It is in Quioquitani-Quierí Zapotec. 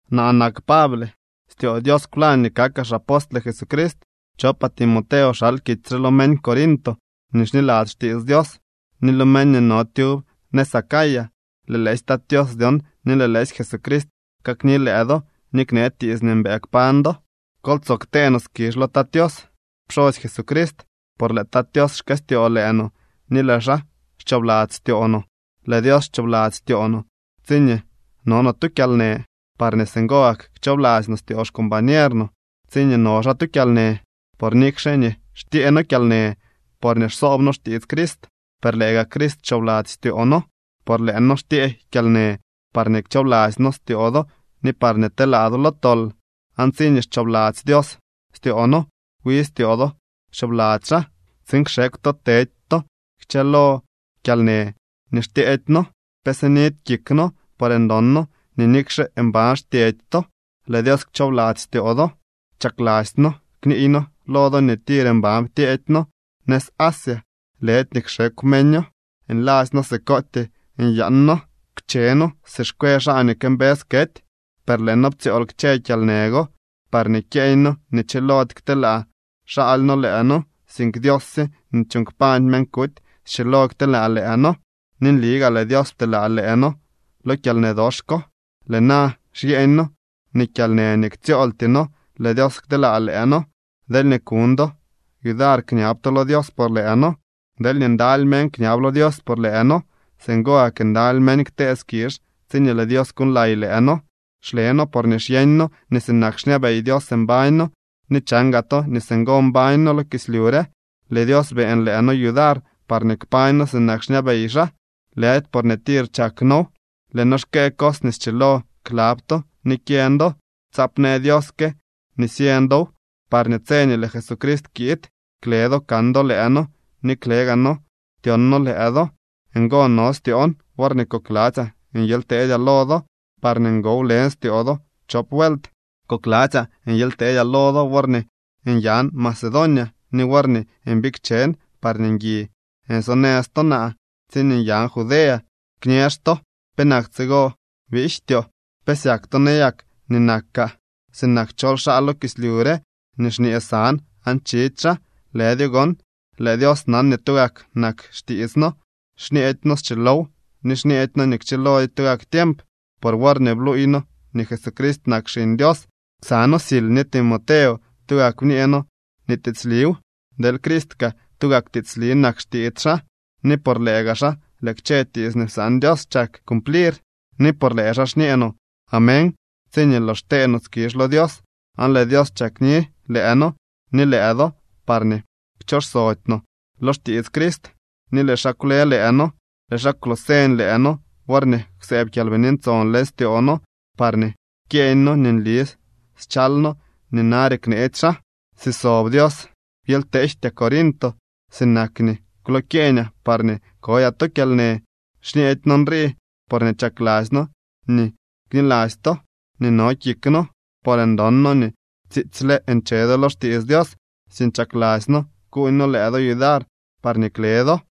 Naa nak Pable. Styoo Dios kwlañ nii kakaa xapostle Jesucrist. Chopaa Timoteo xal kitsy re lo meñ Corinto nii xniladzy xtiits Dios ni lo meñ nii no tyub nëz Acaya. Lëë lëësy Tat Tios dyon ni lëë lëësy Jesucrist kakni lëë do ni knee tiits nii mbëë kpañ do. Kol tsoo ktee no skizh lo Tat Tios, pxosy Jesucrist, por lëë Tat Tios xkëstyoo lëë no ni lëë xaa xchoobladzy styoo no. Lëë Dios xchoobladzy styoo no tsiñee no no tu kyalnë, parñee singo gak kchoobladzy no styoo xcombañer no tsiñee no xaa tu kyalnë. Por nikxe nii xtyee noo kyalnë porñee xsoob noo xtiits Crist, per lëë gak Crist xchoobladzy styoo noo. Por lëë noo xtyee kyalnë parñee kchoobladzy noo styoo do ni parñee telaa do lo tol. Aan tsiñee xchoobladzy Dios styoo noo, wi styoo do xchoobladzy xaa, tsiin kxekw to tedy to kchë lo kyalnë nii xtyeedy noo. Pe sinidy kik noo por ndon noo nii nikxe mban xtyedy to, lëë Dios kchoobladzy styoo do. Chakladzy noo kniiy noo lo do nii tir mban ptyeedy noo nëz Asia, lëdy nii kxekw meño, nladzy noo sikootyee nyaan noo. Pche noo si xkwe xaa nii këmbës kety, per lëë noo ptsyool kchë kyalnë go parñee kyeeñ noo nii chilody kteelaa xaaly noo lëë noo, sink Dios sye nii chuuñ kpañ meñ kuty schilo kteelaa lëë noo. Ni nli gaa lëë Dios pteelaa lëë noo lo kyalnë dox ko. Lëë na xyeeñ noo nii kyalnë nii ktsyooltyee noo lëë Dios kteelaa lëë noo, deelñee kuñ do yudar kñab to lo Dios por lëë noo. Deelñee ndaly meñ kñab lo Dios por lëë noo, singo gak ndaly meñ ktee skizh tsiñee lëë Dios kuuñlay lëë noo. Xle noo porñee xyeeñ noo nii sinak xñabey Dios mbañ noo ni chan gaa to nii singo mbañ noo lo kislyu re. Lëë Dios beeñ lëë noo yudar parñee kpañ noo sinak xñabey xaa, lëdy porñee tir chak noow. Lëë noo xkëë cos nii schilo klab to ni kyeñ do. Tsaap në Dios que nii syeñ dow, parñee tse nii lëë Jesucrist kiid kle do kan do lëë noo ni klee gaa noo tyon noo lëë do. Ngo no styoon worñee kokladzyaa nyely teedyaa lo do, parñee ngo wlen styoo do chop vuelt. Kokladzyaa nyely teedyaa lo do worñee nyan Macedonia ni worñee mbikchen, parñee ngui nsonëz to naa tsiñee nyan Judea. Kñëx to: “¿Penak tsigo biijtyoo?” ¿Pe syak to nayak nii nakaa sinak chol xaa lo kislyu re nii xñee san aan chidy xaa? Lëdyo gon. Lëë Dios nan nii tugak nak xtiits noo. Xñeedy noo schilow ni xñeedy noo kchilodyo tugak tiemp. Por worñee bluuy noo nii Jesucrist nak Xiñ Dios, ksa noo Sil ni Timoteo, tugak bñee noo nii tiitsliw, deel Criist kaa tugak tiitsli nak xtiits xaa. Ni por lëë gaa xaa lëë kchë tiits nii psaan Dios chak cumplir, ni por lëë xaa xñee no “Amén” tsiñee lox xtee no skizh lo Dios. Aan lëë Dios chakni lëë noo ni lëë do parñee kchooxsody no lo xtiits Crist, ni lëë xaa kwle lëë noo. Lëë xaa kwlooseñ lëë no worñee kwsëëb Kyalbini Ntson leñ styoo no parñee kyeeñ no nii nli schal no nii nare kneetsy xaa. Si sob Dios, byely kteejtyaa Corinto sinak nii kwlokyeeñaa parñee kodyaa to kyalnë. Xñeedy noo nrii porñee chakladzy noo nii kniladzy to nii no kik noo, por ndon noo nii tsiitsyle nche do lo xtiits Dios, sink chakladzy noo kuuñ noo lëë do yudar parñee kle do.